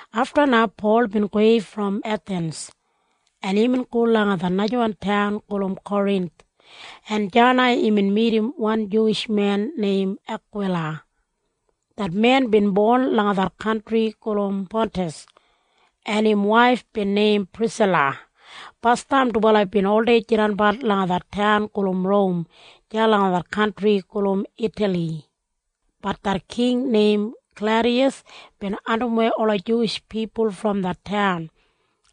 Afta na Pol bin gowei brom Ethins, en imbin go langa det najawan taun gulum Korinth, en deya na imbin midim wan Juwish men neim Akwila. Det men bin bon langa det kantri gulum Pantas, en im waif bin neim Prisila. Basdam dubala bin oldei jidanbat langa det taun gulum Rom deya langa det kantri gulum Itali. Bat det king neim Klaudiyas bin andimwei ola Juwish pipul brom det taun,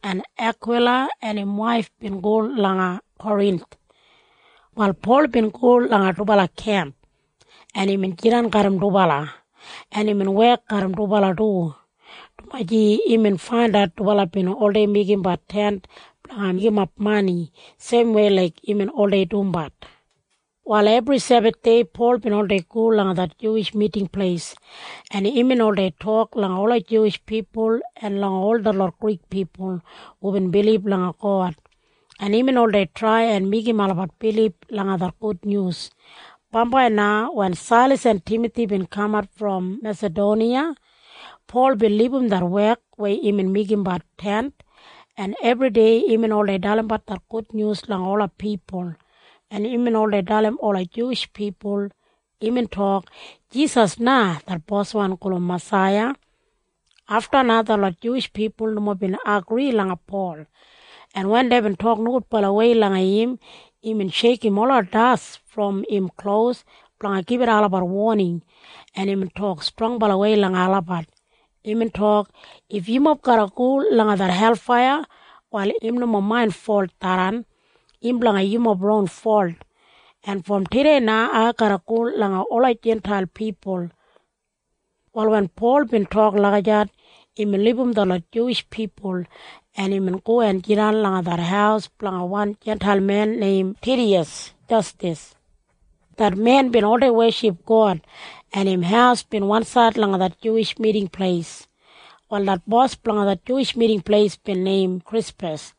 en Akwila en im waif bin go langa Korinth. Wal Pol bin go langa dubala kemp, en imbin jidan garram dubala, en imbin wek garram dubala du, dumaji imbin faindat dubala bin oldei meigimbat tent blanga meigimap mani seimwei laik imbin oldei dumbat. Wal ebri Sebathdei Pol bin oldei go langa det Juwish Miting Pleis, en imbin oldei tok langa ola Juwish pipul en langa ol detlot Grik pipul hubin bilib langa God, en imbin oldei trai en meigim olabat bilib langa det gudnyus. Bambai na wen Sailas en Timathi bin kamat brom Mesadoniya, Pol bin libum det wek weya imbin meigimbat tent, en ebridei imbin oldei dalimbat det gudnyus langa ola pipul, en imbin oldei dalim ola Juwish pipul. Imbin tok, “Jisas na det Boswan gulum Masaiya.” Afta na detlot Juwish pipul nomo bin agri langa Pol, en wen deibin tok nogudbalawei langa im, imbin sheikim ola das brom im klos blanga gibit olabat woning, en imbin tok strongbalawei langa olabat. Imbin tok, “If yumob garra go langa det helfaiya, wal im nomo main folt tharran. Im blanga yumob ron folt. En brom tudei na ai garra go langa ola Jintail pipul.” Wal wen Pol bin tok lagijat, imbin libum detlot Juwish pipul, en imbin go en jidan langa det haus blanga wan Jintail men neim Tidiyas Jastas. Det men bin oldei weship God, en im haus bin wansaid langa det Juwish Miting Pleis. Wal det bos blanga det Juwish Miting Pleis bin neim Krispas,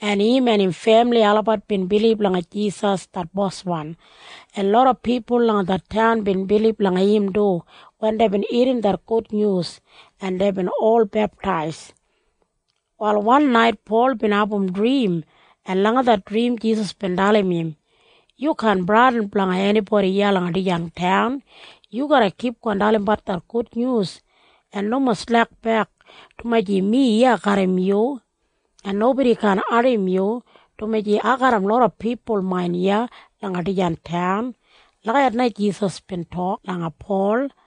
en im en im femili olabat bin bilib langa Jisas det Boswan, en loda pipul langa det taun bin bilib langa im du wen deibin irrim det gudnyus, en deibin ol beptais. Wal wan nait Pol bin abum drim, en langa det drim Jisas bin dalim im, “Yu kaan bradin blanga enibodi iya langa dijan taun. Yu garra kipgon dalimbat det gudnyus en nomo slekbek, dumaji mi iya garram yu, en nobodi kaan ardim yu, dumaji ai garram loda pipul main iya langa dijan taun.” Lagijat na Jisas bin tok langa Pol,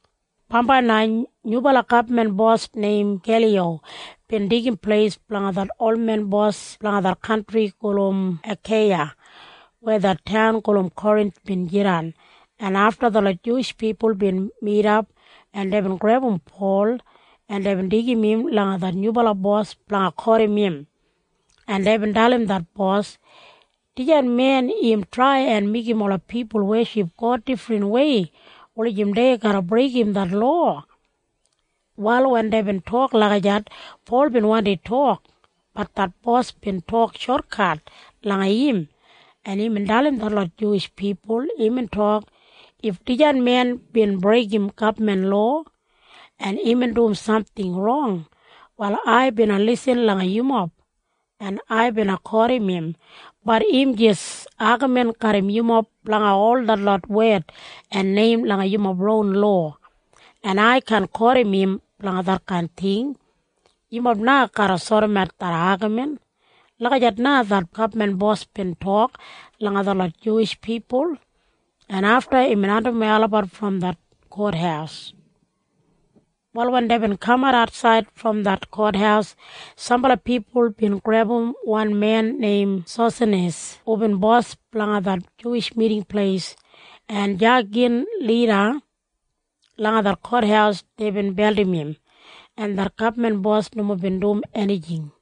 Bambai na nyubala gabman bos neim Geliyo bin deigim pleis blanga det olwan bos blanga det kantri gulum Akeiya weya det taun gulum Korinth bin jidan, en afta detlot Juwish pipul bin midap, en deibin grebum Pol, en deibin deigim im langa det nyubala bos blanga kotim im, en deibin dalim det bos, “Dijan men im trai en meigim ola pipul weship God difrinwei wulijim dei garra breigim det lowa.” Wal wen deibin tok lagijat, Pol bin wandi tok. Bat det bos bin tok shotkat langa im, en imbin dalim detlot Juwish pipul. Imbin tok, “If dijan men bin breigim gabman lowa, en imbin dum samting rong, wal ai bina lisin langa yumob, en ai bina kotim im. Bat im jis agamin garram yumob blanga ol detlot wed en neim langa yumob ron lowa. En ai kaan kotim im blanga detkain ting. Yumob na garra sodimat det agamin.” Lagijat na det gabman bos bin tok langa detlot Juwish pipul, en afta imbin andimwei olabat brom det kothaus. Wal wen deibin kamat atsaid brom det kothaus, sambala pipul bin grebum wan men neim Sosanis hubin bos blanga det Juwish Miting Pleis, en deya gin lida langa det kothaus deibin beldim im, en det gabman bos nomo bin dum enijing.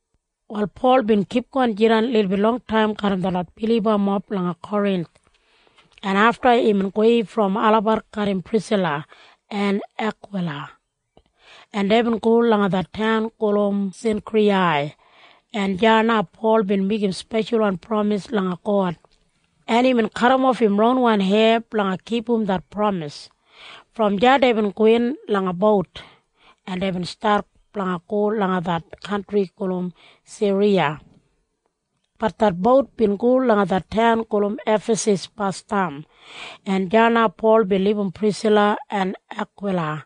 Wal Pol bin kipgon jidan lilbit longtaim garram detlot bilibamob langa Korinth, en afta imbin gowei brom olabat garram Prisila en Akwila, en deibin go langa det taun gulum Sinkriyai, en deya na Pol bin meigim speshalwan pramis langa God, en imbin kadimof im ronwan heya blanga kipum det pramis. Brom deya deibin gowin langa bout, en deibin stat blanga go langa det kantri gulum Siriya. Bat det bout bin go langa det taun gulum Efasas basdam, en deya na Pol bin libum Prisila en Akwila,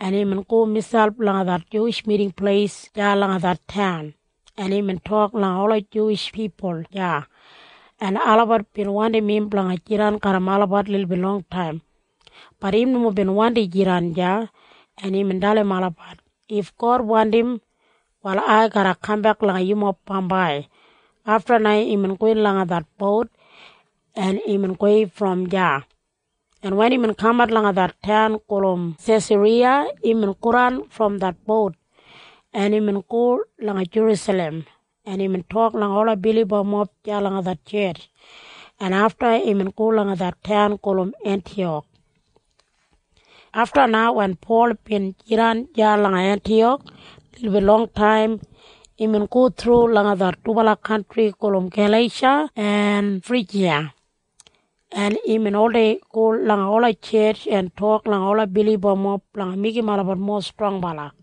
en imbin go miselp langa det Juwish Miting Pleis deya langa det taun, en imbin tok langa ola Juwish pipul deya, en olabat bin wandim im blanga jidan garram olabat lilbit longtaim. Bat im nomo bin wandi jidan deya, en imbin dalim olabat, “If God wandim, wal ai garra kambek langa yumob bambai.” Afta na imbin gowin langa det bout, en imbin gowei brom deya, en wen imbin kamat langa det taun gulum Sesariya, imbin godan brom det bout, en imbin go langa Jerusalem, en imbin tok langa ola bilibamob deya langa det tjetj, en afta imbin go langa det taun gulum Entiyak. Afta na wen Pol bin jidan deya langa Entiyak lilbit longtaim, imbin go thru langa det dubala kantri gulum Galeisha en Frijiya, en imbin oldei go langa ola tjetj en tok langa ola bilibamob blanga meigim olabat mowa strongbala.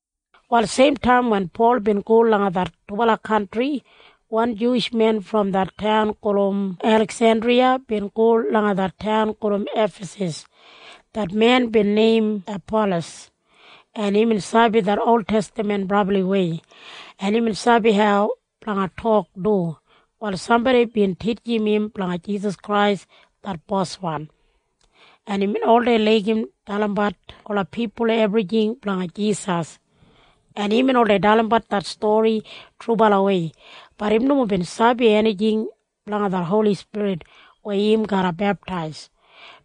Wal seimtaim wen Pol bin go langa det dubala kantri, wan Juwish men brom det taun gulum Eliksendriya bin go langa det taun gulum Efasas. Det men bin neim Apalas, en imbin sabi det oltestaman brabliwei, en imbin sabi hau blanga tok du. Wal sambodi bin titjim im blanga Jisas Krais det Boswan, en imbin oldei laigim dalimbat ola pipul ebrijing blanga Jisas, en imbin oldei dalimbat det stori trubalawei. Bat im nomo bin sabi enijing blanga det Holi Spirit weya im garra beptais,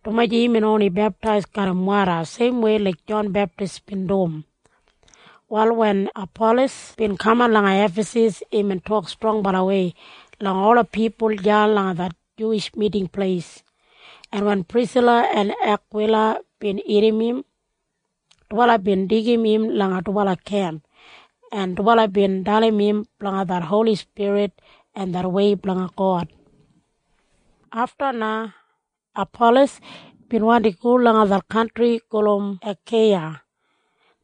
dumaji imbin oni beptais garram woda seimwei laik Jon Beptis bin dum. Wal wen Apalas bin kaman langa Efasas, imbin tok strongbalawei langa ola pipul deya langa det Juwish Miting Pleis, en wen Prisila en Akwila bin irrim im, dubala bin deigim im langa dubala kemp, en dubala bin dalim im blanga det Holi Spirit en det wei blanga God. Afta na Apalas bin wandi go langa det kantri gulum Akeiya.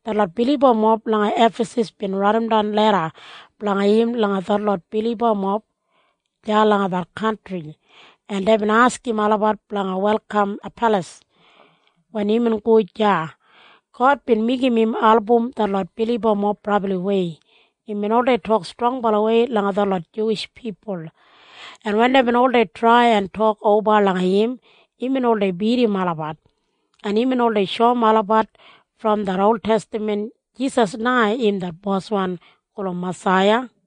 Detlot bilibamob langa Efasas bin raidimdan leda blanga im langa detlot bilibamob deya langa det kantri, en deibin askim olabat blanga welkam Apalas. Wen imbin go deya, God bin meigim im album detlot bilibamob brabliwei. Imbin oldei tok strongbalawei langa detlot Juwish pipul, en wen deibin oldei trai en tok oba langa im, imbin oldei bidim olabat, en imbin oldei shoum olabat brom det oltestaman Jisas na im det Boswan gulum Masaiya.